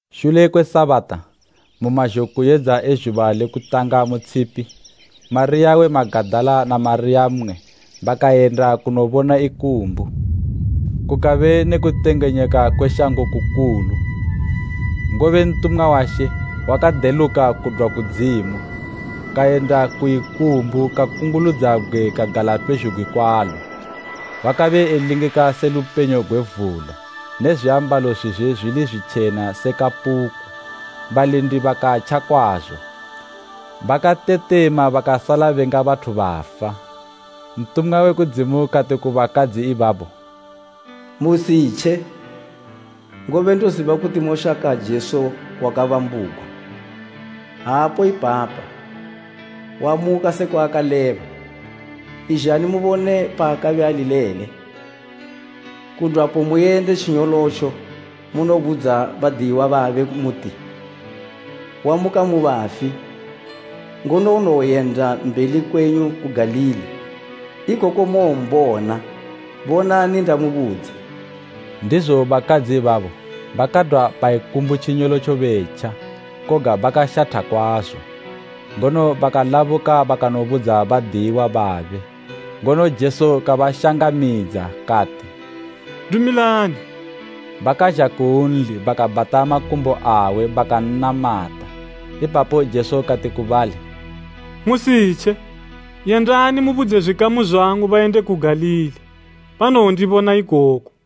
Shule kwe Sabata, mu mazhokuyedza e zhuba le kutanga mu tshipi, Mariya we Magadala na Mariya mmwe bakayenda kunobona ikumbu. Kukabe ne kutengenyeka kwe shango kukulu, ngobe ntumwa wa She wakadeluka kudwa kudzimu, kayenda ku ikumbu kakunguludza bgwe kagala pezhugwi kwalo. Wakabe elingika se lupenyo gwe vula ne zwiambalo zwizwe zwili zwitjena se kapuku. Balindi bakantja kwazo bakatetema bakasala benga bathu bafa. Ntumwa we kudzimu kati ku bakadzi ibabo, “Musitje, ngobe ndoziba kuti moshaka Jesu wakabambugwa. Aapo ipapa, wamuka sekwa akaleba. Izhani mubone paakabe ali lele. Kudwapo muyende tjinyolotjo munobudza badiyiwa babe muti, ‘Wamuka mu bafi,’ ngono unowoyenda mbeli kwenyu ku Galili, ikoko mowombona. Bonani ndamubudza.” Ndizo bakadzi ibabo bakadwa pa ikumbu tjinyolotjo betja, koga bakashatha kwazo, ngono bakalabuka bakanobudza badiyiwa babe. Ngono Jesu kabashangamidza kati, “Dumilani.” Bakazha kunli bakabhata makumbo awe bakan'namata. Ipapo Jesu kati ku bali, “Musitje, yendani mubudze zwikamu zwangu bayende ku Galili, banowondibona ikoko.”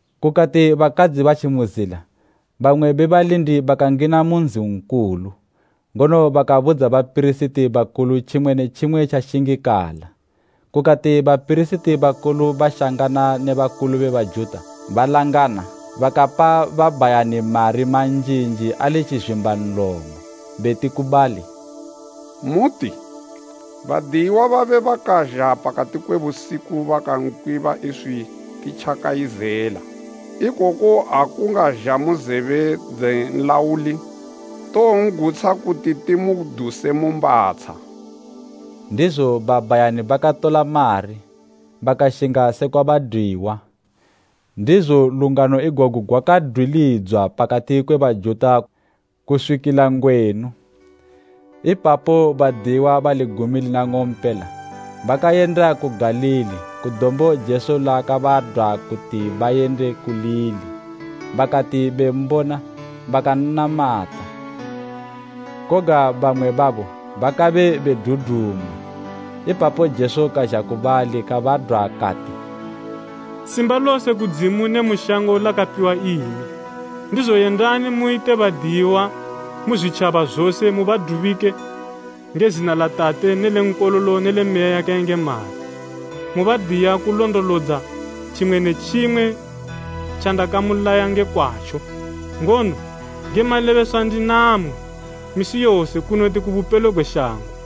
Kukati bakadzi batji mu zila, bamwe be balindi bakangina mu nzi nkulu, ngono bakabudza bapirisiti bakulu tjimwe ne tjimwe tjakashingikala. Kukati bapirisiti bakulu bashangana ne bakulu be Bajuta, balangana, bakapa babhayani mari manjinji ali tjizwimba nlomo, beti ku bali, “Muti, ‘Badiyiwa babe bakazha pakati kwe busiku bakankwiba iswi titjakayizela.’ Ikoku akungazha mu zebe dze nlauli, towon'gutsha kuti timuduse mu mbatsha.” Ndizo babhayani bakatola mari, bakashinga sekwa badwiwa. Ndizo lungano igogu gwakadwilidzwa pakati kwe Bajuta kuswikila ngwenu. Ipapo badiyiwa bali gumi lina ng'ompela bakayenda ku Galili ku dombo Jesu laakabadwa kuti bayende kulili. Bakati bembona bakan'namata, koga bamwe babo bakabe bedudumwa. Ipapo Jesu kazha ku bali kabadwa kati, “Simba lose kudzimu ne mu shango lakapiwa imi. Ndizo yendani muyite badiyiwa mu zwitjaba zose mubadubike nge zina la Tate ne le Nkololo ne le Meya yakayengemala, mubadiya kulondolodza tjimwe ne tjimwe tjandakamulaya nge kwatjo. Ngono nge malebeswa ndinamwi misi yose kunoti ku bupelo gwe shango.”